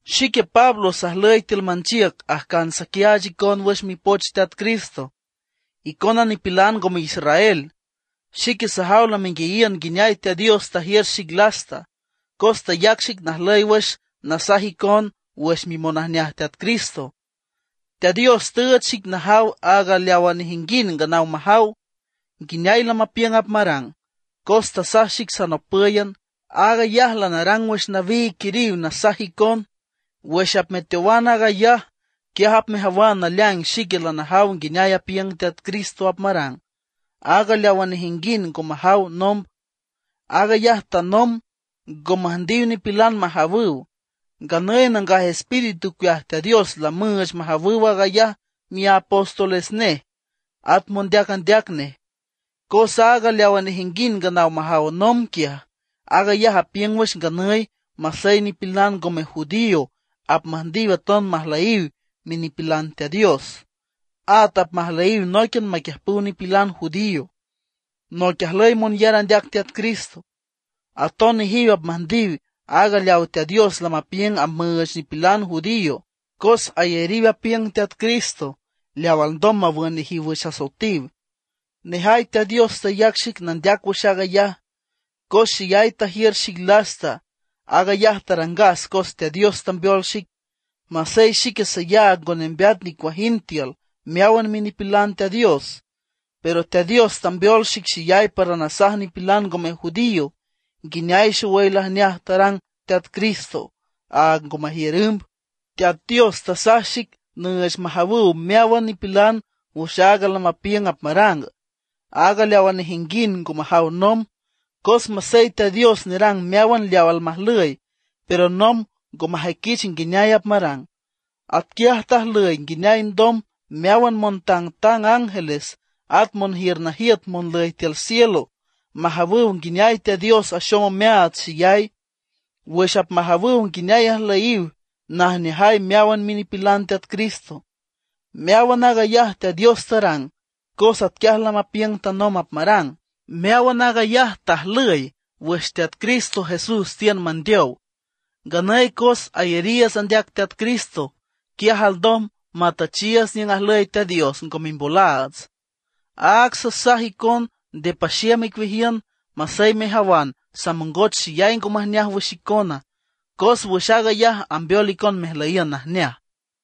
Xique Pablo sajlüy tiül manchiüc ajcan saquiaach icon wüx Mipoch Teat Cristo, icona nipilan ngome israel. Xique sajaw lamenguiayiün nguineay Teat Dios tajiür xic lasta, cos tayac xic najlüy wüx nasaj icon wüx mimonajneaj Teat Cristo. Teat Dios tüüch xic najaw aaga leawa nejinguind nganaw majaw, nguineay lamapiüng apmarang, cos tasaj xic sanopǘyan. Aag ayaj lanarang wüx nawiig quiriw nasaj icon. Wüx apmeteowan aag ayaj, quiaj apmejawan naleaing xique lanajaw nguineay apiüng Teat Cristo apmarang, aaga leawa nejinguind ngo majaw nomb. Aag ayaj tanomb ngo müjndiw nipilan majawüw. Nganüy Nangaj Espíritu ocueaj Teat Dios lamüüch majawüw aag ayaj miapóstoles nej, at mondeac andeac nej. Cos aaga leaw nejinguind nganaw majaw nomb quiaj, aag ayaj apiüng wüx nganüy masey nipilan ngome judío apmüjndiw aton majlüyiw minipilan Teat Dios; at apmajlüyiw nóiquian maquiüjpüw nipilan judío, noic ajlüy monyar andeac Teat Cristo. Aton nejiw apmüjndiw aaga leaw Teat Dios lamapiüng apmüüch nipilan judío, cos ayariw apiüng Teat Cristo leaw alndom mawün nejiw wüx asoetiw. Nejay Teat Dios tayac xic nandeac wüx aag ayaj, cos xeyay tajiür xic lasta. Aag ayaj tarangas cos Teat Dios tambeol xic. Masey xique sayaag ngo nembeat nicuajind tiül meáwan minipilan Teat Dios, pero Teat Dios tambeol xic xeyay para nasaj nipilan ngome judío nguineay xowüy lajneaj tarang Teat Cristo, aag ngo majiür ümb. Teat Dios tasaj xic nüüch majawüw meáwan nipilan wüx aag lamapiüng apmarang, aag leawa nejinguind ngo majaw nomb; cos masey Teat Dios nerang meáwan leaw almajlüy, pero nomb ngo majüiquich nguineay apmarang. Atquiaj tajlüy nguineay ndom meáwan montangtang ángeles at monjiür najiüt monlüy tiül cielo, majawüw nguineay Teat Dios axom omeaats xeyay, wüx apmajawüw nguineay ajlüyiw najneajay meáwan minipilan Teat Cristo. Meáwan aag ayaj Teat Dios tarang, cos atquiaj lamapiüng tanomb apmarang. Meáwan aag ayaj tajlüy wüx Teat Cristo Jesús tiün mandeow. Nganüy cos ayariiüts andeac Teat Cristo, quiaj alndom matüchiiüts niüng ajlüy Teat Dios ngo mimbolaats. Áag sasaj icon nde paxiüm icueajiün masey mejawan samongoch xeyay ngo majneaj wüx icona, cos wüx aag ayaj ambeol icon mejlüyiün najneaj.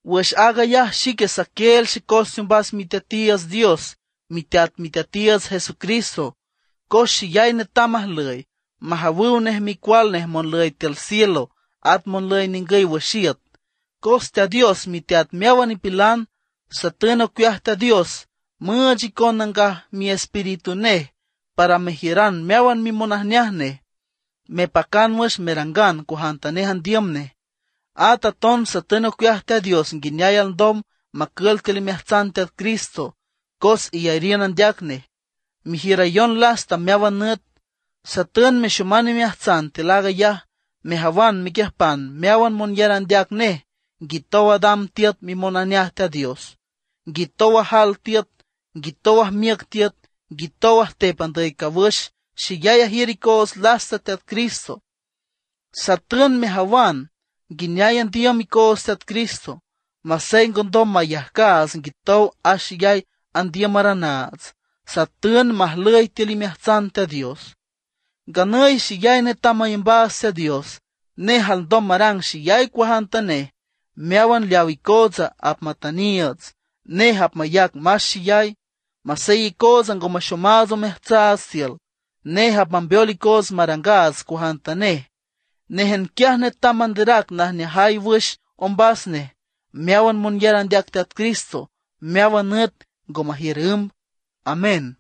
Wüx aag ayaj xique saquieel xecos teombas Miteatiiüts Dios, Miteat Miteatiiüts Jesucristo, cos xeyay netam ajlüy, majawüw nej micual nej monlüy tiül cielo at monlüy ningüy wüx iüt, cos Teat Dios miteat meáwan nipilan. Satün ocueaj Teat Dios müüch icon Nangaj Miespíritu nej para mejiüran meáwan mimonajneaj nej, mepacan wüx merangan cuajantanej andiüm nej. At aton satün ocueaj Teat Dios nguineay alndom macül tiül imeajtsan Teat Cristo cos iyariün andeac nej, mejiürayon lasta meáwan nüt. Satün mexoman imeajtsan tiül aag ayaj, mejawan mequiüjpan meáwan monyar andeac nej nguitow adam tiüt mimonajneaj Teat Dios, nguitow ajal tiüt, nguitow ajmiüc tiüt, nguitow ajtep andüy cawüx xeyay ajiür icoots lasta Teat Cristo. Satün mejawan nguineay andiüm icoots Teat Cristo, masey ngondom mayajcaats nguitow axeyay andiümaranaats. Satün majlüy tiül imeajtsan Teat Dios. Nganüy xeyay netam mayambaats Teat Dios; nej alndom marang xeyay cuajantanej, meáwan leaw icootsa apmatüniiüts. Nej apmayac más xeyay, masey icootsa ngo maxomaats omeajtsaats tiül. Nej apmambeol icoots marangaats cuajantanej. Néjan quiaj netam manderac najneajay wüx ombas nej meáwan monyar andeac Teat Cristo meáwan nüt ngo majiür ümb. Amén.